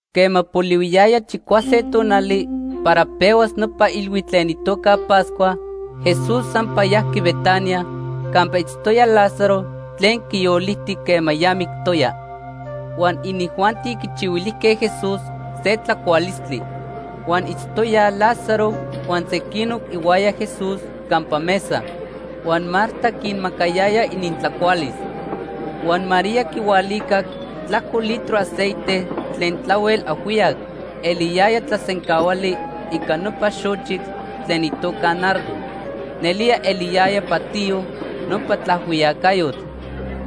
Quema polihuiyaya chicuase tonali para pehuas nopa ilhuitl tlen itoca Pascua, Jesús sampa yajqui Betania campa itztoya Lázaro tlen quiyoliti quema ya mictoya. Huan inijuanti quichihuilijque Jesús se tlacualistli. Huan itztoyaj Lázaro huan sequinoc ihuaya Jesús campa mesa. Huan Marta quinmacayaya inintlacualis. Huan María quihualicac tlajco litro aceite tlen tlahuel ajhuiyac eliyaya tlasencahuali ica nopa xochitl tlen itoca nardo. Nelía eliyaya patiyo nopa tlaajhuiyacayotl.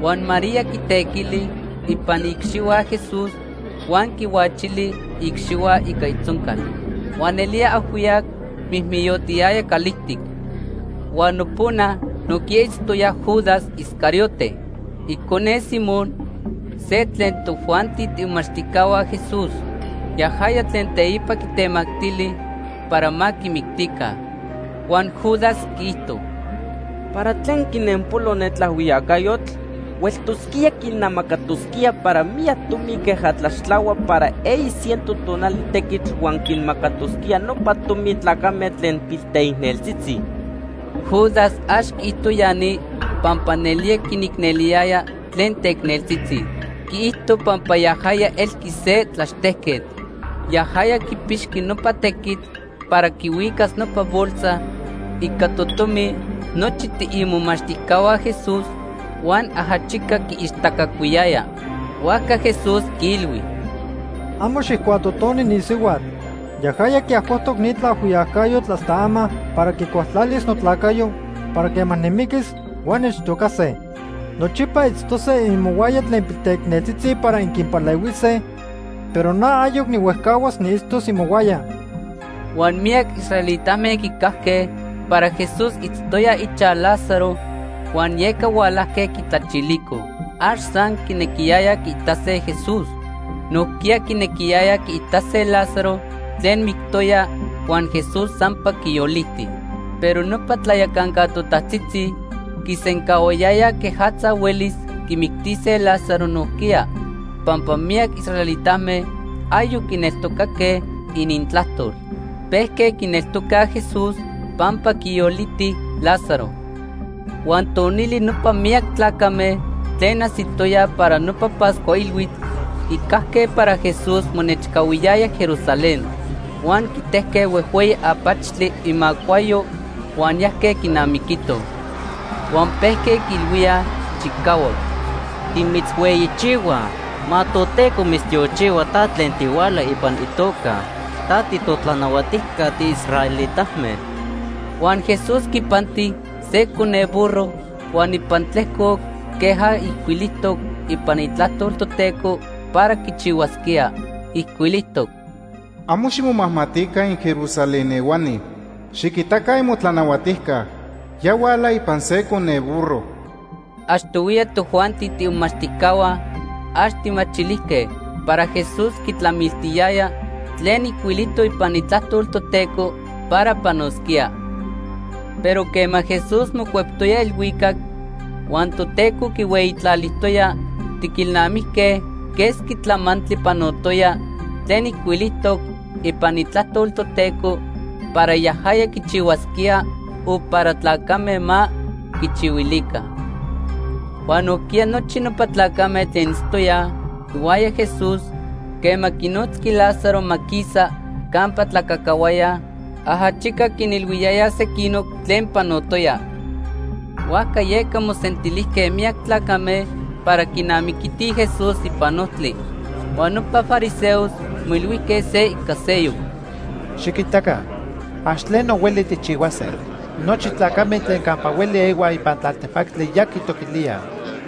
Huan María quitequili ipan iicxihua Jesús huan quihuachili iicxihua ica itzoncal. Huan nelía ajhuiyac mijmiyotiyaya calijtic. Huan nopona nojquiya itztoya Judas Iscariote, icone Simón, se tlen tojuanti tiimomachtijcahua Jesús. Yajaya tlen teipa quitemactili para ma quimictica. Huan Judas quiijto: ―¿Para tlen quinenpolo ne tlaajhuiyacayotl? Hueltosquía quinamacatosquía para miyac tomi queja tlaxtlahuaj para eyi ciento tonali tequitl huan quinmacatosquía nopa tomi tlacame tlen pilteicneltzitzi. Judas ax quiijto ya ni pampa nelía quinicneliyaya tlen teicneltzitzi. Quiijto pampa yajaya elqui se tlaxtejquetl. Yajaya quipixqui nopa tequitl para quihuicas nopa bolsa ica totomi nochi tiimomachtijcahua Jesús huan ajachica quiixtacacuiyaya. Huajca Jesús quiilhui: ―Amo xijcuatotoni ni sihuatl. Yajaya quiajcoctoc ni tlaajhuiyacayotl hasta ama para quicualtlalis notlacayo para quema nimiquis huan nechtocase. Nochipa itztose imohuaya tlen pilteicneltzitzi para inquinpalehuise, pero na ayoc nihuejcahuas niitztos imohuaya. Huan miyac israelitame quicajque para Jesús itztoya ichaj Lázaro huan yeca hualajque quitlachilicoj. Ax san quinequiyayaj quiitase Jesús. Nojquiya quinequiyayaj quiitase Lázaro tlen mictoya huan Jesús sampa quiyoliti. Pero nopa tlayacanca totajtzitzi quisencahuayayaj quejatza huelis quimictise Lázaro nojquiya, pampa miyac israelitame ayoc quinneltocaque inintlajtol. Pejque quineltocaj Jesús pampa quiyoliti Lázaro. Huan tonili nopa miyac tlacame tlen ajsitoyaj para nopa Pascua Ilhuitl quicajque para Jesús monechcahuiyaya Jerusalén. Huan quitejque huejhueyi apachtli imacuayo huan yajque quinamiquitoj. Huan pejque quiilhuíaj chicahuac: “¡Timitzhueyichihuaj! ¡Ma Toteco mitztiochihua ta tlen tihuala ipan itoca! ¡Ta titotlanahuatijca tiisraelitame!” Huan Jesús quipanti se cone burro huan ipan tlejcoc queja ijcuilijtoc ipan Itlajtol Toteco para quichihuasquía. Ijcuilijtoc: “Amo ximomajmatica inJerusalén ehuani. Xiquitaca imotlanahuatijca ya huala ipan se cone burro.” Achtohuiya tojuanti tiimomachtijcahua ax tijmachilijque para Jesús quitlamiltiyaya tlen ijcuilijtoc ipan Itlajtol Toteco para panosquía. Pero quema Jesús mocueptoya elhuicac huan Toteco quihueyitlalijtoya, tiquilnamijque quesqui tlamantli panotoya tlen ijcuilijtoc ipan Itlajtol Toteco para yajaya quichihuasquía o para tlacame ma quichihuilica. Huan nojquiya nochi nopa tlacame tlen itztoyaj ihuaya Jesús quema quinotzqui Lázaro ma quisa campa tlacacahuaya ajachica quinilhuiyayaj sequinoc tlen panotoya. Huajca yeca mosentilijque miyac tlacame para quinamiquitij Jesús ipan ojtli. Huan nopa fariseos moilhuijque se ica seyoc: ―Xiquitaca, ax tleno hueli tijchihuase. Nochi tlacame tlen campa hueli ehuaj ipan tlaltepactli ya quitoquilíaj.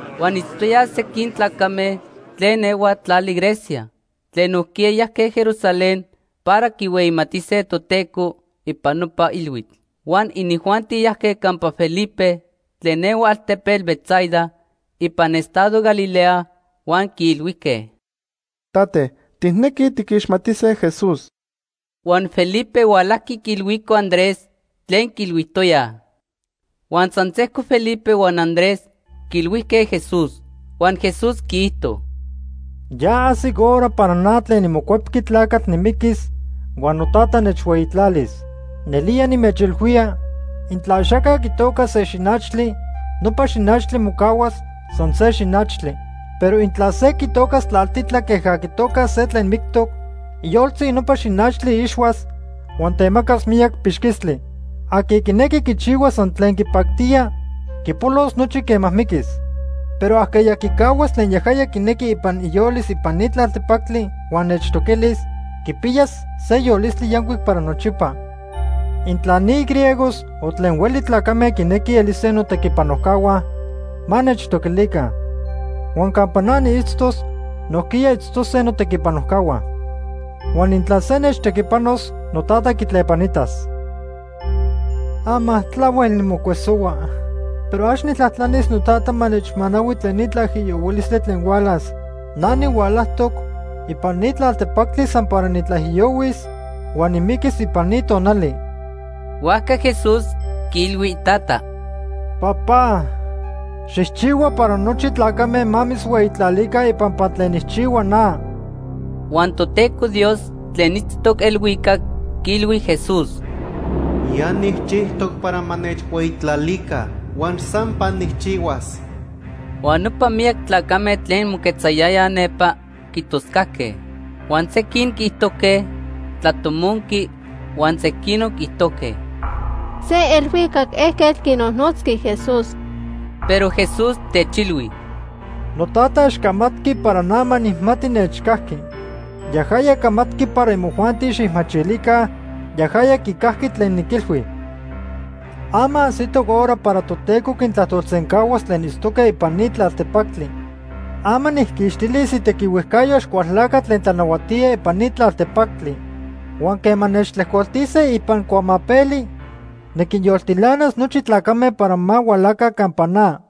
Huan itztoyaj sequin tlacame tlen ehuaj tlali Grecia tlen nojquiya yajque Jerusalén para quihueyimatise Toteco ipan nopa ilhuitl. Huan inijuanti yajque campa Felipe tlen ehua altepetl Betsaida ipan estado Galilea huan quiilhuijque: ―Tate, tijnequij tiquixmatise Jesús. Huan Felipe hualajqui quiilhuico Andrés tlen quiilhuijtoyaj. Huan san sejco Felipe huan Andrés quiilhuijque Jesús. Huan Jesús quiijto: ―Ya ajsic hora para na tlen niMocuepqui Tlacatl nimiquis huan noTata nechhueyitlalis. Nelía nimechilhuía, intla axaca quitocas se xinachtli, nopa xinachtli mocahuas san se xinachtli. Pero intla se quitocas tlaltitla queja quitocaj se tlen mictoc, iyoltzi nopa xinachtli ixhuas huan temacas miyac pixquistli. Aqui quinequi quichihuas san tlen quipactía, quipolos nochi quema miquis. Pero ajqueya quicahuas tlen yajaya quinequi ipan iyolis ipan ni tlaltepactli huan nechtoquilis, quipiyas se yolistli yancuic para nochipa. Intla ni griegos o tlen hueli tlacame quinequij elise notequipanojcahua, ma nechtoquilica. Huan campa na niitztos, nojquiya itztose notequipanojcahua. Huan intla se nechtequipanos, noTata quitlepanitas. “Ama tlahuel nimocuesohua, pero ax nijtlajtlanis noTata ma nechmanahui tlen ni tlaijiyohuilistli tlen hualas. Na nihualajtoc ipan ni tlaltepactli san para nitlaijiyohuis huan nimiquis ipan ni tonali.” Huajca Jesús quiilhui iTata: “Papá, xijchihua para nochi tlacame ma mitzhueyitlalica ipampa tlen nijchihua na.” Huan Toteco Dios tlen itztoc elhuicac quiilhui Jesús: “Ya nijchijtoc para ma nechhueyitlalica huan sampa nijchihuas.” Huan nopa miyac tlacame tlen moquetzayayaj nepa quitoscajque. Huan sequin quiijtojque tlatomonqui huan sequinoc quiijtojque: ―Se elhuicac ejquetl quinojnotzqui Jesús. Pero Jesús techilhui: ―NoTata ax camatqui para na ma nijmati nechcajqui. Yajaya camatqui para imojuanti xijmachilica yajaya quicajqui tlen niquilhui. Ama ajsitoc hora para Toteco quintlajtolsencahuas tlen itztoque ipan ni tlaltepactli. Ama nijquixtilis itequihuejcayo Axcualtlacatl tlen tlanahuatía ipan ni tlaltepactli. Huan quema nechtlejcoltise ipan cuamapeli, niquinyoltilanas nochi tlacame para ma hualaca campa na.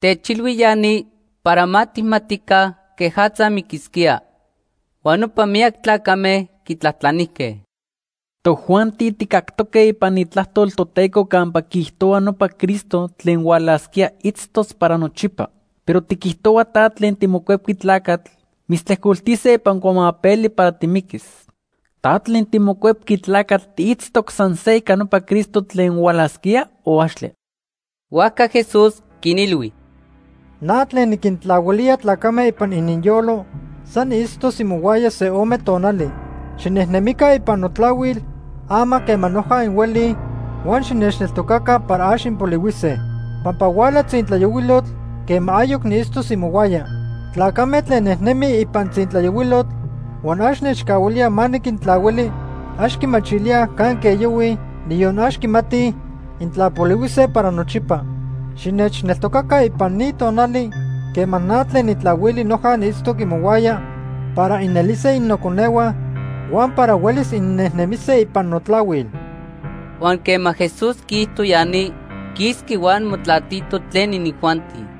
Techilhui ya ni para ma tijmatica quejatza miquisquía. Huan nopa miyac tlacame quitlajtlanijque: ―Tojuanti tijcactoque ipan Itlajtol Toteco campa quiijtohua nopa Cristo tlen hualasquía itztos para nochipa. Pero tiquijtohua ta tlen tiMocuepqui Tlacatl, mitztlejcoltise ipan cuamapeli para timiquis. ¿Ta tlen tiMocuepqui Tlacatl tiitztoc san se ica nopa Cristo tlen hualasquía o axtle? Huajca Jesús quinilhui: ―Na tlen niquintlahuilía tlacame ipan ininyolo san niitztos imohuaya se ome tonali. Xinejnemica ipan notlahuil ama quema noja inhuelij huan xinechneltocaca para ax inpolihuise. Pampa huala tzintlayohuilotl quema ayoc niitztos imohuaya. Tlacame tlen nejnemij ipan tzintlayohuilotl huan ax nechcahuilíaj ma niquintlahuili, ax quimachilíaj canque yohuij, niyon ax quimatij intla polihuise para nochipa. Xinechneltocaca ipan ni tonali quema na tlen nitlahuili noja niitztoc imohuaya para inelise innoconehua huan para huelis innejnemise ipan notlahuil. Huan quema Jesús quiijto ya ni, quisqui huan motlatito tlen inijuanti.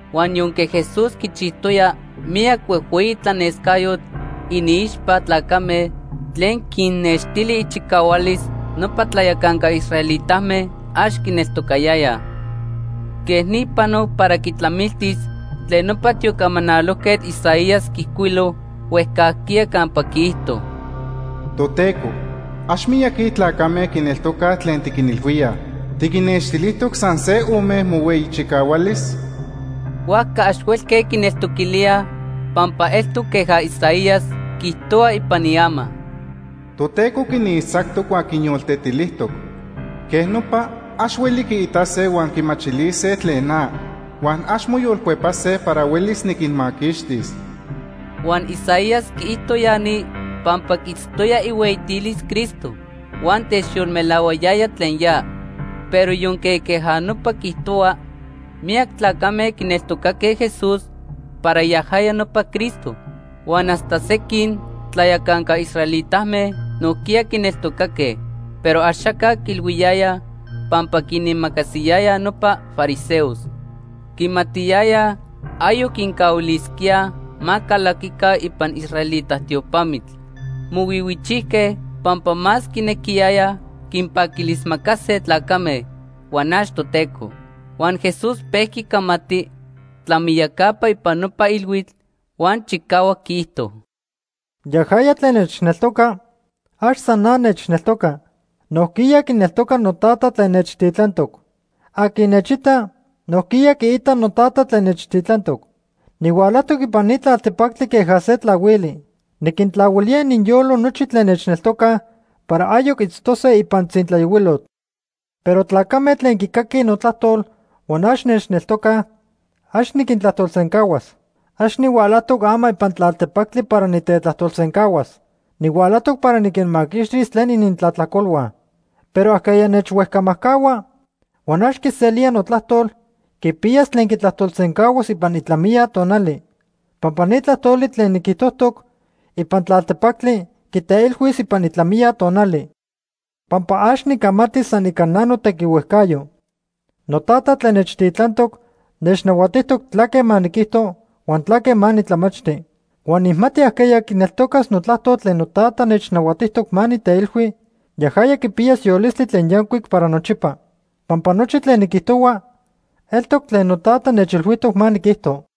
Huan yonque Jesús quichijtoya miyac huejhueyi tlanescayotl iniixpa tlacame tlen quinnextili ichicahualis, nopa tlayacanca israelitame ax quineltocayayaj. Quej ni panoc para quitlamiltis tlen nopa tiocamanalojquetl Isaías quiijcuilo huejcajquiya campa quiijto: “Toteco, ax miyaqui tlacame quineltocaj tlen tiquinilhuíaj. ¿Tiquinnextilijtoc san se ome mohueyi chicahualis?” Huajca ax huelque quineltoquilíaj pampa eltoc queja Isaías quiijtohua ipan iama: “Toteco quinixtzactoc huan quinyoltetilijtoc. Quej nopa ax hueli quiitase huan quimachilise tlen na, huan ax moyolcuepase para huelis niquinmaquixtis.” Huan Isaías quiijto ya ni pampa quiitztoya ihueyitilis Cristo huan techyolmelahuayaya tlen ya. Pero yonque queja nopa quiijtohua, miyac tlacame quineltocaque Jesús para yajaya nopa Cristo. Huan hasta sequin tlayacanca israelitame nojquiya quineltocaque, pero axaca quiilhuiyayaj pampa quinimacasiyayaj nopa fariseos. Quimatiyayaj ayoc quincahuilisquíaj ma calaquica ipan israelita tiopamitl. Mohuihuichijque pampa más quinequiyayaj quinpaquilismacase tlacame, huan ax Toteco. Huan Jesús pejqui camati tlamiyacapa ipan nopa ilhuitl huan chicahuac quiijto: “Yajaya tlen nechneltoca, ax san na nechneltoca. Nojquiya quineltoca noTata tlen nechtitlantoc. Aqui nechita, nojquiya quiita noTata tlen nechtitlantoc. Nihualajtoc ipan ni tlaltepactli queja se tlahuili. Niquintlahuilía ininyolo nochi tlen nechneltocaj para ayoc itztose ipan tzintlayohuilotl. Pero tlacame tlen quicaquij notlajtol huan ax nechneltocaj, ax niquintlajtolsencahuas. Ax nihualajtoc ama ipan tlaltepactli para nitetlajtolsencahuas. Nihualajtoc para niquinmaquixtis tlen inintlajtlacolhua. Pero ajqueya nechhuejcamajcahua huan ax quiselía notlajtol quipiyas tlen quitlajtolsencahuas ipan itlamiya tonali. Pampa ni tlajtoli tlen niquijtojtoc ipan tlaltepactli quiteilhuis ipan itlamiya tonali. Pampa ax nicamati san ica na notequihuejcayo. NoTata tlen nechtitlantoc nechnahuatijtoc tlaque ma niquijto huan tlaque ma nitlamachti. Huan nijmati ajqueya quineltocas notlajtol tlen noTata nechnahuatijtoc ma niteilhui, yajaya quipiyas yolistli tlen yancuic para nochipa. Pampa nochi tlen niquijtohua eltoc tlen noTata nechilhuijtoc ma niquijto.”